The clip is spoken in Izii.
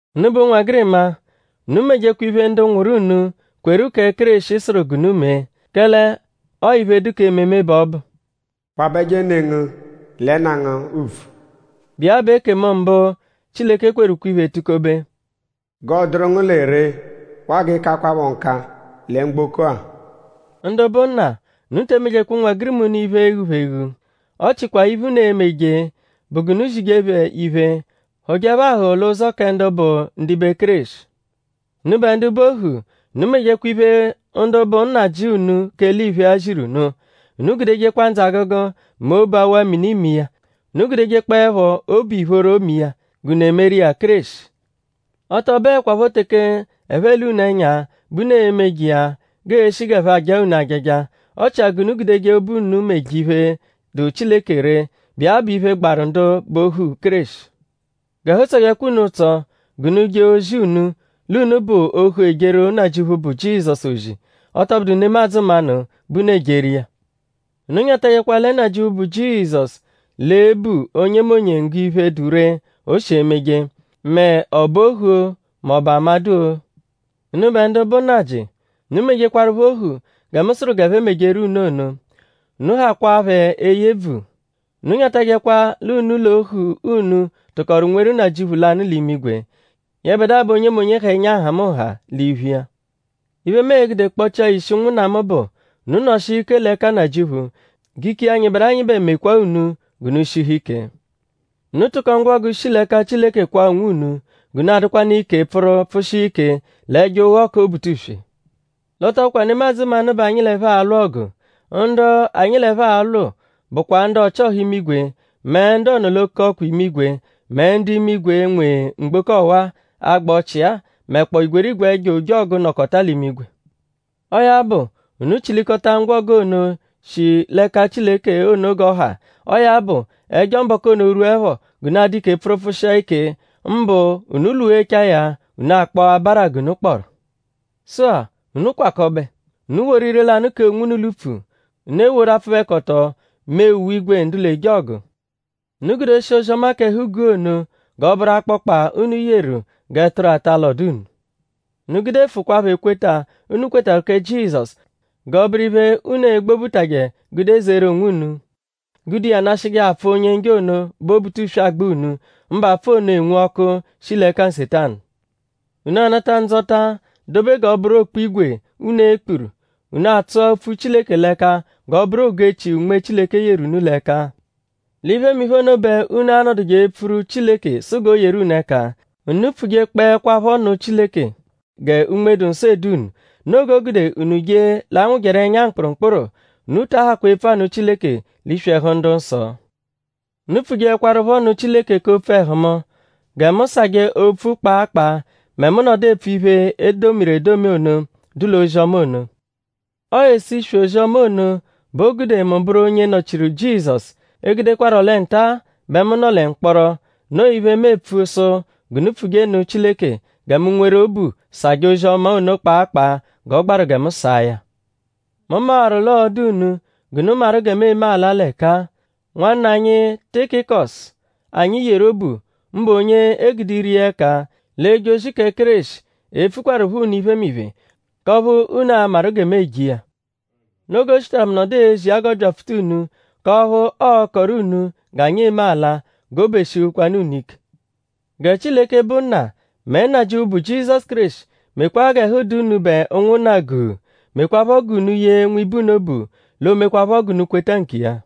Unubẹ ụnwegirima; unu mejekwa iphe ndu nwụru unu, kweru kẹ Kéreshi sụru g'unu mee. Kẹle ọo iphe, dụ k'ememe bẹ ọ bụ. “Kwabẹje ne ngu lẹ nna ngu ùbvù;” bụ iya bụ ekemu mbụ, Chileke kweru ukwe-iphe tukobe. “G'ọo-dụru ngu lẹ ree waa g'ịikakwapho nka lẹ mgboko-a.” Ndu bụ nna; unu te emejekwa ụnwegirima unu iphe e-ghu phẹ eghu. Ọ chikwa iphe, unu e-meje bụ g'unu zije phẹ iphe; hụ̀je phẹ ahụ̀hù l'ụzo kẹ ndu bụ ndibe Kéreshi. Unubẹ ndu bụ ohu; unu mejekwa iphe ndu bụ nnajị unu k'eliphe-a ziru unu. Unu gudejekwa ndzụ-agụgu; mẹ obu awa mini me iya. Unu gudejekpọepho obu ìphóró me iya; g'unu emeru iya Kéreshi. Ọ tọ bụekwapho teke ẹphe ele unu ẹnya bẹ unu emeje iya g'ee-shi g'ẹphe ajaa unu ajaja. Ọ chia g'unu gudeje obu unu meje iphe, dụ Chileke ree, bụ iya bụ iphe, gbaru ndu bụ ohu Kéreshi. G'ẹhu tsọjekwa unu ụtso g'unu je ozi unu l'unu bụ ohu ejeru Nnajịuphu, bụ Jizọsu ozi; ọ tọ bụdu nemadzụ mmanụ bẹ unu ejeru iya. Unu nyatajẹkwa lẹ Nnajịuphu, bụ Jizọsu l'e-bu onyemonye obunggo iphe, dụ ree, o shi emeje; mẹ?ị bụ ohu-o; mẹ?ị bụ amadụ-o. Unubẹ ndu bụ nnajị; unu mejekwaruphọ ohu gẹ mu sụru g'ẹphe mejeru unu ono. Unu hakwaa phẹ eye ebvu. Unu nyatajẹkwa l'unu l'ohu unu tụkoru nweru Nnajịuphu lanụ l'imigwe. Yẹbedua bẹ onyemonye ha ẹnya nhamụnha l'iphu iya. Iphe, mu e-gude kpọchia ya ishi ụnwunna mu bụ; unu nọshia ike l'ẹka Nnajịuphu; g'ike iya, nyịberu anyịbe mekwa unu g'unu shihu ike. Unu tụko ngwọgu, shi l'ẹka Chileke kwaa onwunu; g'unu adụkwanu ike pfụru pfụshia ike l'ẹjo ụgho kẹ Obutuswe. L'ọ tọ bụkwa nemadzụ mmanụ bẹ anyi l'ẹphe alwụ ọgu. Ndu anyi l'ẹphe alwụ bụkwa ndu ọchi-ọha imigwe; mẹ ndu ọ-nọ-l'oke-ọkwa imigwe; mẹ ndu imigwe, nwe mgboko ọwa-a, agba ọchii-a; mẹkpoo igwerigwe ẹjo ojọgu, nọkota l'imigwe. Ọo ya bụ; unu chilikọta ngwọgu ono, shi l'ẹka Chileke ono g'ọ ha! Ọo ya bụ; ẹjo mbọku ono -rwuẹpho g'unu adụ ike pfụru pfụshia ike; mbụ unu -lwụghechaa ya; unu akpọo abara g'unu kpọru. Sụ-a; unu kwakọbe! Unu woru ire-lanụ kee onwunu l'upfu. Unu eworu apfụbekoto mee uwe-ígwè ndu l'eje ọgu. Unu gudeshia ozi-ọma k'ẹhu-guu ono g'ọ bụru akpọkpa, unu yeru g'ẹturu ata alọdu unu. Unu gudefụkwaapho ekweta, unu kwetarụ kẹ Jizọsu g'ọ bụru iphe unu e-gbobeje gude zeru onwunu; gude iya nashịje apfụ, Onye-Njọ ono, bụ Obutuswe agba unu; mbụ apfụ ono, enwu ọku, shi l'ẹka Nsetanu. Unu anata ndzọta dobe g'ọ bụru okpu-ígwè, unu e-kpuru. Unu atsụa opfu Chileke l'ẹka g'ọ bụru ogu-echi, Unme Chileke yeru unu l'ẹka. L'iphemiphe ono bẹ unu a-nọduje epfuru Chileke sụ g'o yeru unu ẹka. Unu pfuje-kpọekwapho nụ Chileke gẹ Unme-dụ-Nsọ edu unu. Noo g'o gude unu je l'anwụjeru ẹnya mkpụrumkpuru. Unu ta ahakwa epfu anụ Chileke l'iswi ẹhu ndu-nsọ. Unu pfujekwarụpho nụ Chileke k'opfu ẹhu mu; gẹ mu sajẹ opfu kpaa kpaa; mẹ mu -nọdu epfu iphe, e domiru edomi ono, dụ l'ozi-ọma ono. Ọo ese iswi ozi-ọma ono bẹ o gude mu bụru onye nọ-chiru Jizọsu; egudekwarọ lẹ nta-a bẹ mu nọ lẹ mkpọro. Noo iphe, mu epfu sụ g'unu pfuje nụ Chileke gẹ mu nweru obu sajẹ ozi-ọma ono kpaa kpaa g'ọ gbaru gẹ mu saa ya. Mu mawaru l'ọo-dụ unu g'unu maru gẹ mu eme ala l'ẹka-a. Nwanna anyi Tikikọsu, anyi yeru obu; mbụ onye e gude ire iya ẹka l'eje ozi kẹ Kéreshi e-pfukwarụpho unu iphemiphe; k'ọphu unu a-maru gẹ mu eje iya. Noo g'o shitaru mu nọdu ezi iya g'ọ byapfuta unu; k'ọphu ọo-kọru unu g'anyi eme ala; g'obu eshihukwanu unu ike. Gẹ Chileke, bụ Nna; mẹ Nnajịuphu bụ Jizọsu Kéreshi mekwaa g'ẹhu dụ unubẹ ụnwunna guu; mekwaphọ g'unu yee nwibe unu obu; l'o mekwaphọ g'unu kweta nkiya.